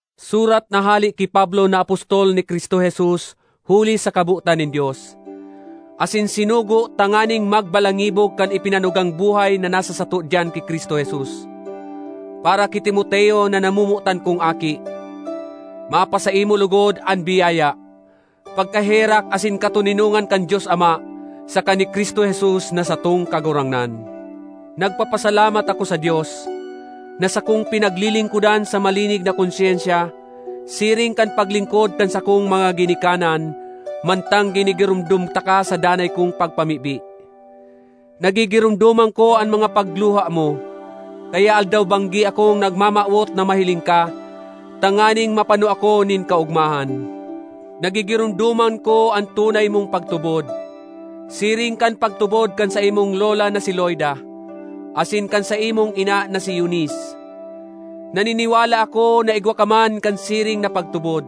Surat na hale ki Pablo na apostol ni Cristo Jesus huli sa kabotan nin Dios, asin sinugo tanganing magbalangibog kan ipinanugang buhay na nasa sato diyan ki Cristo Jesus. Para ki Timoteo na namomotan kong aki: Mapasaimo logod an biyaya, pagkaherak asin katoninongan kan Dios Ama saka ni Cristo Jesus na satong Kagurangnan. Nagpapasalamat ako sa Dios, na sakong pinaglilingkodan sa malinig na konsyensya, siring kan paglingkod kan sakong mga ginikanan, mantang ginigiromdom taka sa danay kong pagpamibi. Nagigiromdoman ko an mga pagluha mo, kaya aldaw-banggi akong nagmamawot na mahiling ka, tanganing mapano ako nin kaogmahan. Nagigiromdoman ko an tunay mong pagtubod, siring kan pagtubod kan saimong lola na si Loida asin kan saimong ina na si Eunice. Naniniwala ako na igwa ka man kan siring na pagtubod.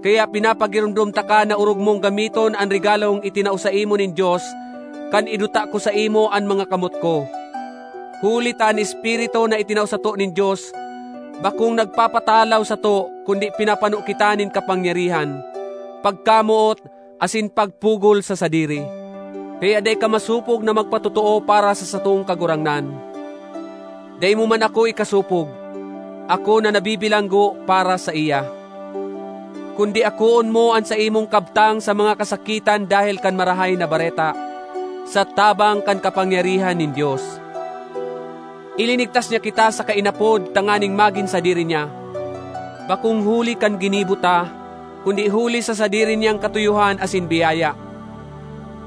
Kaya pinapagiromdom taka na orog mong gamiton an regalong itinao saimo nin Dios kan iduta ko saimo an mga kamot ko. Huli ta an Espiritu na itinao sato nin Dios bakong nagpapatalaw sato kundi pinapano kita nin kapangyarihan, pagkamoot asin pagpugol sa sadiri. Kaya dai ka masopog na magpatotoo para sa satong Kagurangnan; dai mo man ako ikasopog, ako na nabibilanggo para saiya. Kundi akoon mo an saimong kabtang sa mga kasakitan dahel kan Marahay na Bareta, sa tabang kan kapangyarihan nin Dios. Ilinigtas niya kita saka inapod tanganing magin sadiri niya, bakong huli kan ginibo ta, kundi huli sa sadiri niyang katuyohan asin biyaya.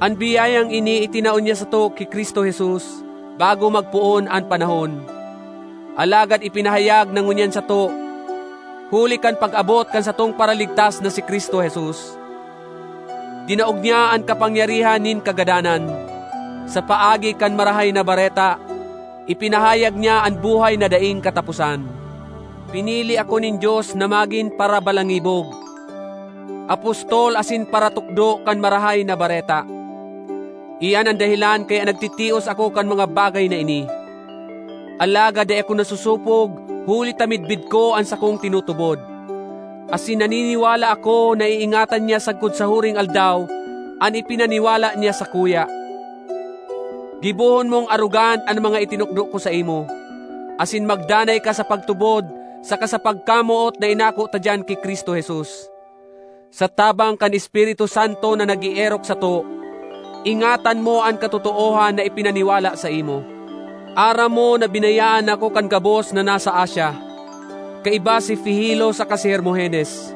An biyayang ini itinao niya sato ki Cristo Jesus bago magpoon an panahon, alagad ipinahayag na ngunyan sato huli kan pag-abot kan satong Paraligtas na si Cristo Jesus. Dinaog niya an kapangyarihan nin kagadanan; sa paagi kan Marahay na Bareta, ipinahayag niya an buhay na daing kataposan. Pinili ako nin Dios na magin parabalangibog, apostol asin paratukdo kan Marahay na Bareta; iyan an dahelan kaya nagtitios ako kan mga bagay na ini. Alagad dai ako nasosopog huli ta midbid ko an sakong tinutubod, asin naniniwala ako na iingatan niya sagkod sa huring Aldaw an ipinaniwala niya sakuya. Gibohon mong arogan an mga itinukdo ko saimo, asin magdanay ka sa pagtubod saka sa pagkamoot na inako ta diyan ki Cristo Jesus. Sa tabang kan Espiritu Santo na nag-eerok sato, ingatan mo an katotoohan na ipinaniwala saimo. Aram mo na binayaan ako kan gabos na nasa Asia, kaiba si Figelo saka si Hermogenes.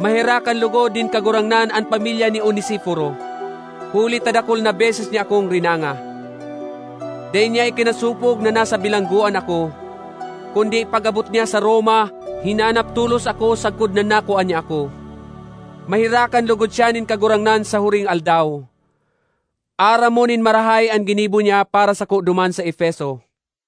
Maherakan logod nin Kagurangnan an pamilya ni Onesiforo, huli ta dakul na beses niya akong rinanga. Dai niya ikinasopog na nasa bilanggoan ako, kundi pag-abot niya sa Roma hinanap tolos ako sagkod na nakua niya ako. Maherakan logod siya nin Kagurangnan sa huring Aldaw. Aram mo nin marahay an ginibo niya para sako duman sa Efeso.